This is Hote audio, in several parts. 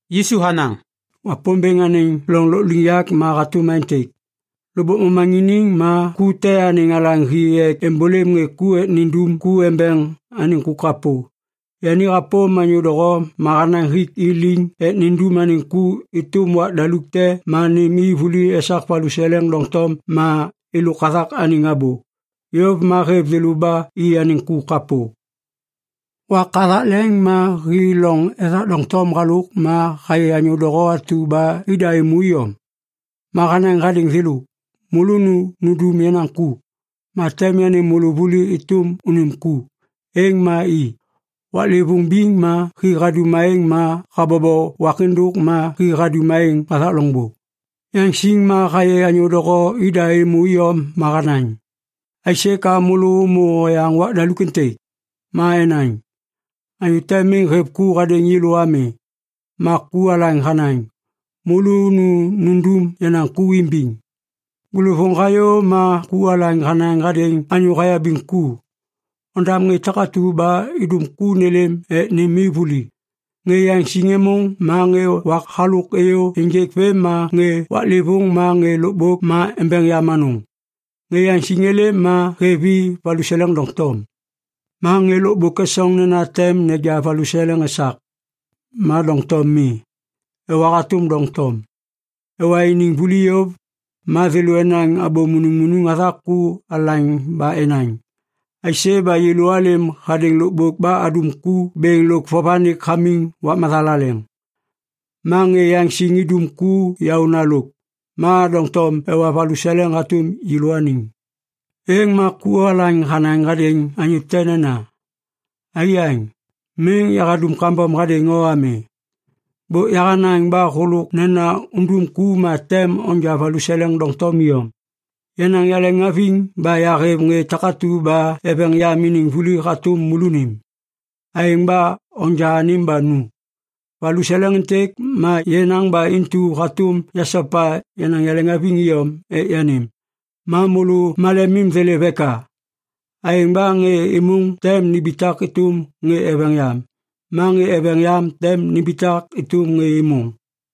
Yisu hanaŋ, “Wapômbêŋ anêŋ loŋ lôkliŋyak ma hatôm aêntêk. Lôkbôk momaŋiniŋ ma ku te anêŋ alaŋ hi ek êmbôlêm ŋê ku ek nindum ku embeŋ anêŋ ku kapô. Yani hapôm anyô doho ma hanaŋ hik i liŋ ek nindum anêŋ ku êtôm wak daluk te ma nêm i vuli esak valuseleŋ doŋtom ma êlôk hathak anêŋ abô. Yôv ma hêv thêlô ba i anêŋ ku kapô. “Wak hathak leŋ ma hi loŋ ethak doŋtom halôk ma hayê anyô doho atu ba ida êmô iyom. Ma hanaŋ hadêŋ thêlô, ‘Môlô nu nundum yenaŋ ku, ma tem yanêm môlô vuli êtôm unim ku.’ Êŋ ma i. “Waklêvôŋ biŋ ma hi hadum aêŋ ma habobo wak êndôk ma hi hadum aêŋ hathak loŋbô. Yaŋsiŋ ma hayê anyô doho ida êmô iyom ma hanaŋ, ‘Aisê ka môlô ômô oyaŋ wak daluk êntêk?’ “Ma enaŋ, ‘Anyô te miŋ hêv ku hadêŋ yêlô ami.’ “Ma ku alaŋ hanaŋ, ‘Môlô nu nundum yenaŋ ku imbiŋ.’ “Bôlôvôŋ hayô ma ku alaŋ hanaŋ hadêŋ anyô hayabiŋ ku, ‘Ondam ŋê takatu ba idum ku nêlêm ek nêm i vuli. Ŋê yaŋsiŋ êmôŋ ma ŋê wak halôk êyô ênjêk vêm ma ŋê waklêvôŋ ma ŋê lôkbôk ma embeŋ yam anôŋ.’ “Ŋê yaŋsiŋ êlêm ma hêv i valuseleŋ doŋtom. Ma ŋê lôkbôk esoŋ nena tem neja valuseleŋ esak. Ma doŋtom mi. Ewa hatôm doŋtom. Ewa iniŋ vuli yôv, ma thêlô enaŋ abô munuŋmunuŋ hathak ku alaŋ ba enaŋ, ‘Aisê ba yêlô alêm hadêŋ lôkbôk ba adum ku bêŋ lôk vovanik hamiŋ wak mathalaleŋ. Ma ŋê yaŋsiŋ idum ku yaôna lôk. Ma doŋtom ewa valuseleŋ hatôm yêlôaniŋ!’ “Êŋ ma ku alaŋ hanaŋ hadêŋ anyô te nena, ‘Aiyaŋ, miŋ yahadum kambom hadêŋ o ami. Bôk yahanaŋ ba hôlôk nena undum ku ma tem onja valuseleŋ doŋtom iyom. Yenaŋ yaleŋhaviŋ ba yahêv ŋê takatu ba eveŋ yam iniŋ vuli hatôm môlônim. Aêŋ ba onja anêm ba nu! Valuseleŋ êntêk ma yenaŋ ba intu hatôm yasopa yenaŋ yaleŋhaviŋ iyom ek yanêm. Ma môlô malemim thêlêv eka?’ “Aêŋ ba ŋê êmôŋ tem nimbitak êtôm ŋê eveŋ yam. Ma ŋê eveŋ yam tem nimbitak êtôm ŋê êmôŋ.”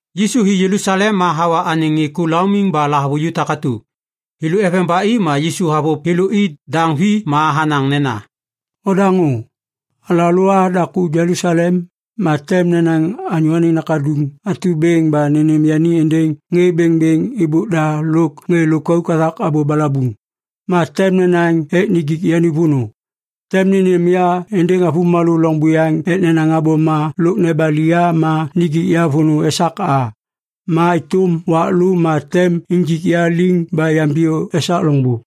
Yisu hi Jelusalem ma hawa anêŋ ŋê ku laumiŋ ba lahavuju takatu. Thêlô eveŋ ba i ma Yisu havôv thêlô i daŋ vi ma hanaŋ nena, “Odaŋô. Alalô a daku Jelusalem. Ma tem nenaŋ Anyô Anêŋ Nakaduŋ atu bêŋ ba nênêm yani êndêŋ ŋê bêŋbêŋ êbôk da lôk ŋê lôkauk hathak abô balabuŋ. Ma tem nenaŋ ek nijik yani vônô. Tem nênêm ya êndêŋ avômalô loŋ buyaŋ ek nenaŋ abôma lôk nebali ya ma nijik ya vônô esak a. Ma êtôm wak lô, ma tem injik ya liŋ ba yambiyô esak loŋbô.”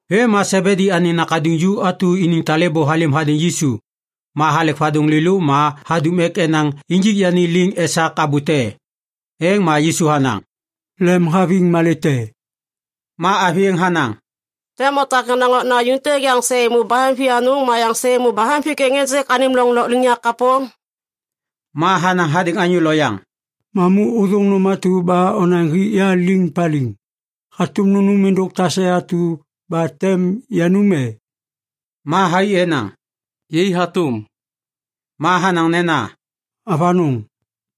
Vêm ma Sebedi anêŋ nakaduŋ ju atu iniŋ talêbô halêm hadêŋ Yisu. Ma halek vadôŋ lêlô ma hadum ek enaŋ injik yani liŋ esak abô te. Êŋ ma Yisu hanaŋ, “Lemhaviŋ malê te?” Ma avi êŋ hanaŋ, “Tem otak yenaŋ okna ju êntêk yaŋ sê êmô bahem vianôŋ ma yaŋ sê êmô bahem vikeŋ ênjêk anêm loŋ lôkliŋyak kapô?” Ma hanaŋ hadêŋ anyô loyaŋ, “Mamu ôthôŋ nôm atu ba onaŋ hik ya liŋ paliŋ. Hatôm nunum êndôk tase atu ba tem yanum e?” Ma thai enaŋ, “Yai hatôm.” Ma hanaŋ nena, “Avanôŋ,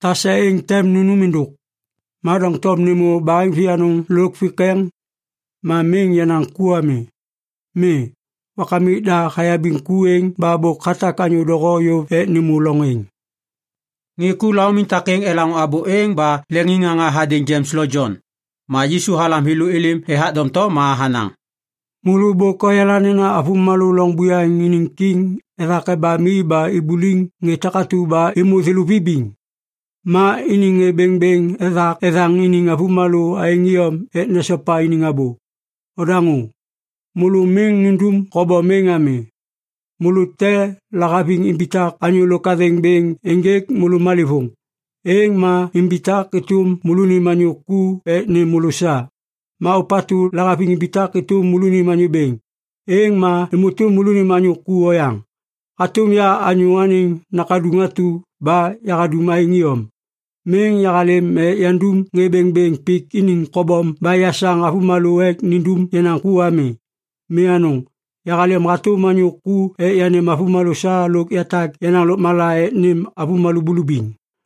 tase êŋ tem nunum êndôk. Ma doŋtom nêmô yabaheŋ vianôŋ lôk vikeŋ, ma miŋ yenaŋ ku ami. Mi, Wakamik da hayabiŋ ku êŋ ba bôk hatak anyô doho yôv ek nêmô loŋ êŋ.” Ŋê ku laumiŋ takêŋ elaŋô abô êŋ ba leŋiŋŋaŋa hadêŋ Jems lo Jon. Ma Yisu halam thêlô êlêm ethak doŋtom ma hanaŋ, “Môlô bôk oyala nena avômalô loŋ buyaŋ iniŋ kiŋ ethak ebam i ba ibuliŋ ŋê takatu ba êmô thêlô vibiŋ. Ma iniŋ ŋê bêŋbêŋ ethak ethaŋ iniŋ avômalô aêŋ iyom ek nesopa iniŋ abô. Odaŋô! Môlô miŋ nundum kobom êŋ ami! Môlô te lahaviŋ imbitak anyô lôk athêŋ bêŋ ênjêk môlô malêvôŋ, êŋ ma imbitak êtôm môlônim anyô ku ek nêm môlô sa. Ma ôpatu lahaviŋ imbitak êtôm môlônim anyô bêŋ, êŋ ma êmô êtôm môlônim anyô ku oyaŋ hatôm ya Anyô Anêŋ Nakaduŋ atu ba yahadum aêŋ iyom. Miŋ yahalêm ek yandum ŋê bêŋbêŋ pik iniŋ kobom ba yasaŋ avômalô ek nindum yenaŋ ku ami. Mi anôŋ! Yahalêm hatôm anyô ku ek yanêm avômalô sa lôk yatak yenaŋ lôkmala ek nêm avômalô bulubiŋ.”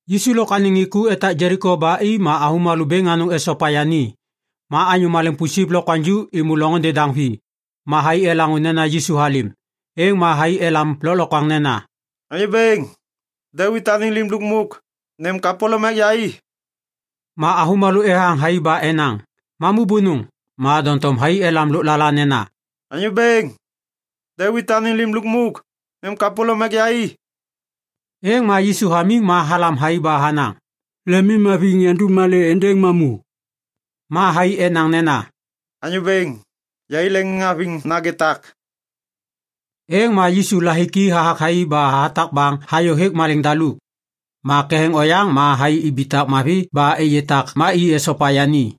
Yisu lôk anêŋ ŋê ku etak Jeliko ba i ma avômalô bêŋ anôŋ esopa yani. Ma anyô maleŋ pusip lokwaŋju êmô loŋôndê daŋ vi, ma thai elaŋô nena Yisu halêm. Êŋ ma thai elam lôklokwaŋ nena, “Anyô Bêŋ! Devit anêŋ Lim Lukmuk! Nêm kapôlôm ek yai!” Ma avômalô ethaŋ thai ba enaŋ, “Mamu bônôŋ!” Ma doŋtom thai elam lôklala nena, “Anyô Bêŋ! Devit anêŋ Lim Lukmuk! Nêm kapôlôm ek yai!” Êŋ ma Yisu hamiŋ ma halam thai ba hanaŋ, “Lemimhaviŋ yandum malê êndêŋ mamu?” Ma thai enaŋ nena, “Anyô Bêŋ, yai leŋiŋhaviŋ nagê tak!” Êŋ ma Yisu lahiki hathak thai ba hatak baŋ hayô hêk maleŋiŋ daluk. Ma ketheŋ oyaŋ ma thai ibitak mavi ba êyê tak ma i esopa yani.